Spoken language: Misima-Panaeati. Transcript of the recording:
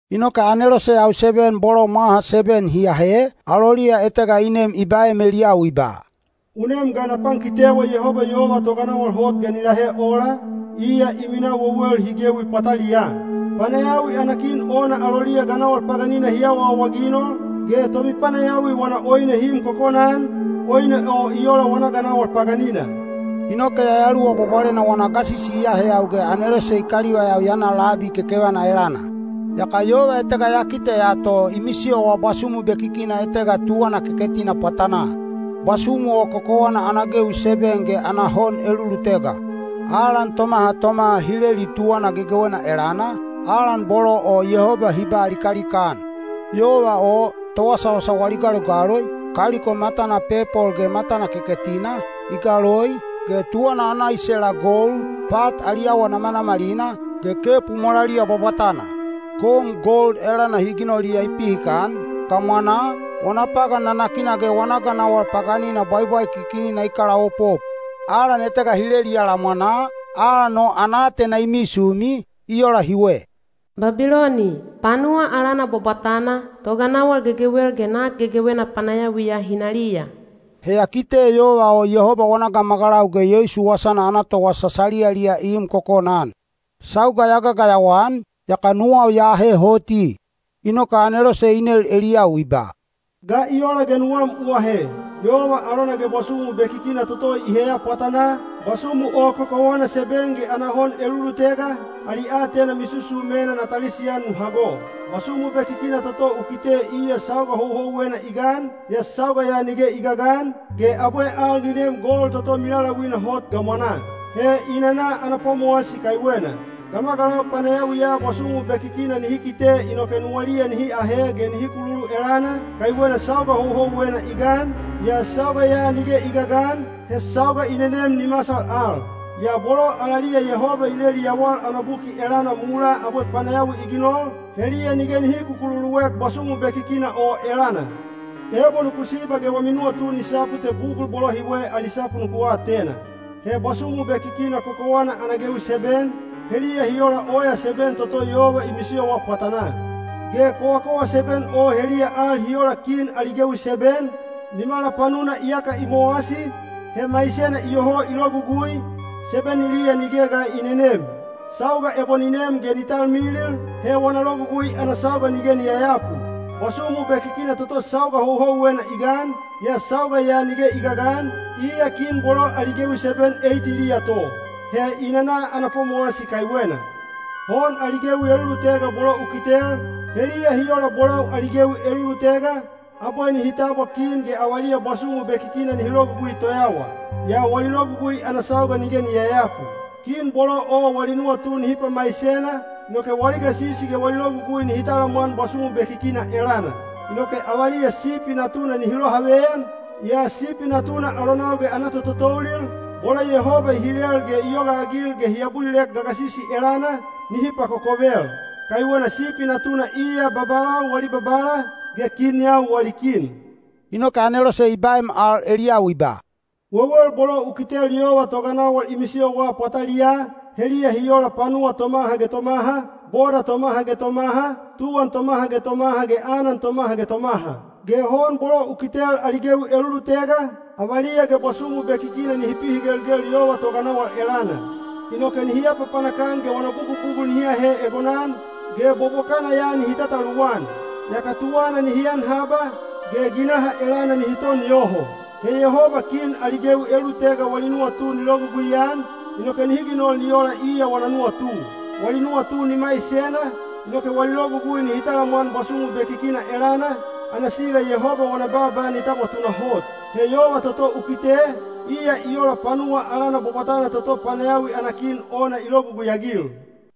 Inoke aneloseyau seben bolo mwaha seben hi ahe, aloliya etega i nem i baem eliyau i ba, “U nem ge na pankitewa Yehoba yova toganawal hot ga ni lahe ola, iya i minaa wewel hi gewi pwataliyaa. Panayawi ana kin ona aloliya ganawal paganina hi awaawaginol, ge tomipanayawi wana oine hi im kokona-an, oine o i ola wana ganawal paganina.” Inoke Yayaluwa Bwabwalena wana gasisi i aheyau ge anelose i kalivaiyau ya na labi kekevana elana. Yaka yova etega ya kiteya to i misiyowa bwasumu bekikina etega tuwana keketina pwatanaa. Bwasumu o kokowana ana gewi seben ge ana hon elulutega. Alan tomaha tomaha hi leli tuwana gegewena elana, alan bolo o Yehoba hi ba likalika-an. Yova o, towasawasa wali galogaloi, kaliko matana pepol ge matana keketina, i galoi, ge tuwana ana isela gold, pat ali awa namanamalina, ge kepu molaliya bwabwatana. Kom gold elana hi ginoliya i pihikan, gamwanaa, wana pagan nanakina ge wana ganawal paganina bwaibwaikikinina i kalaopop. Alan etega hi leliya lamwanaa, alan o ana aatena i misumi, i ola hiwe: “Babiloni, panuwa alana bwabwatana, toganawal gegewel ge nak gegewena panayawiya hinaliya.” He ya kite yova o Yehoba wana gamagalau ge Yeisu wasana ana towasa saliyaliya i im kokona-an. Sauga ya gagayawa-an, yaka nuwau ya ahe hoti. Inoke anelose i nel eliyau i ba, “Ga i ola ge nuwam u ahe? Yova alona ge bwasumu bekikina toto i heya pwatanaa, bwasumu o kokowana seben ge ana hon elulutega, ali aatena misusumena na talisian nu hago. Bwasumu bekikina toto u kite iya sauga houhouwena i gan, yaa sauga ya nige i gagan, ge abwe al ni neem gol toto milaulauina hot gamwanaa. He i nana ana pwamowasi kaiwena. Gamagalau panayawiya bwasumu bekikina nihi kite inoke nuwaliya nihi ahe ge nihi kululu elana, kaiwena sauga houhouwena i gan, yaa sauga ya nige i gagan, he sauga i nenem ni masal al. Yaa bolo alaliya Yehoba i leli yawal ana buki elana mulaa abwe panayawi i ginol, heliya nige nihi kukululuek bwasumu bekikina o elana. Ebo nuku siba ge wami nuwatu ni sapu te bugul bolo hiwe ali sapu nuku atena. He bwasumu bekikina kokowana ana gewi seben, heliya hi ola oya seben toto yova i misiyowa pwatanaa. Ge kowakowa seben o heliya al hi ola kin ali gewi seben, nimala panuna iyaka hi mowasi, he maisena iyoho i logugui, sebeniliya nige ga i nenem. Sauga ebo ni nem ge ni talmilil, he wana logugui ana sauga nige ni yayapu. Bwasumu bekikina toto sauga houhouwena i gan, yaa sauga ya nige i gagan, iya kin bolo ali gewi seben eitiliya to. He i nana ana pwamowasi kaiwena. Hon ali gewi elulutega bolo u kitel, heliya hi ola bolau ali gewi elulutega, abwe nihi tabwa kin ge avaliya bwasumu bekikina nihi logugui toyawa. Yaa wali logugui ana sauga nige ni yayapu. Kin bolo o wali nuwatu nihi pamaisena, inoke wali gasisi ge wali logugui nihi talamwan bwasumu bekikina elana. Inoke avaliya Sipi Natuna nihi lohaveyan, yaa Sipi Natuna alonau ge ana tototoulil, bolo Yehoba i hilel ge i yogaagil ge hi abulilek gagasisi elana, nihi pakokovel. Kaiwena Sipi Natuna iya babalau wali Babala, ge kinyau wali Kin.” Inoke anelose i baem al eliyau i ba, “Wewel bolo u kitel yova toganawal i misiyowa pwataliyaa, heliya hi ola panuwa tomaha ge tomaha, boda tomaha ge tomaha, tuwan tomaha ge tomaha ge anan tomaha ge tomaha. Ge hon bolo u kitel ali gewi elulutega, avaliya ge bwasumu bekikina nihi pihigelgel yova toganawal elana. Inoke nihi apapanak-an ge wana bugubugul nihi ahe egonan, ge bobokana ya nihi tataluwan. Yaka tuwana nihi an haba, ge ginaha elana nihi ton yoho. He Yehoba kin ali gewi elulutega wali nuwatu ni logugui-an, inoke nihi ginol ni ola iya wana nuwatu. Wali nuwatu ni maisena, inoke wali logugui nihi talamwan bwasumu bekikina elana, ana siga Yehoba wana baaba ni tabwa tunahot. He yova toto u kite, iya i ola panuwa alana bwabwatana toto panayawi ana kin ona i logugui-agil.”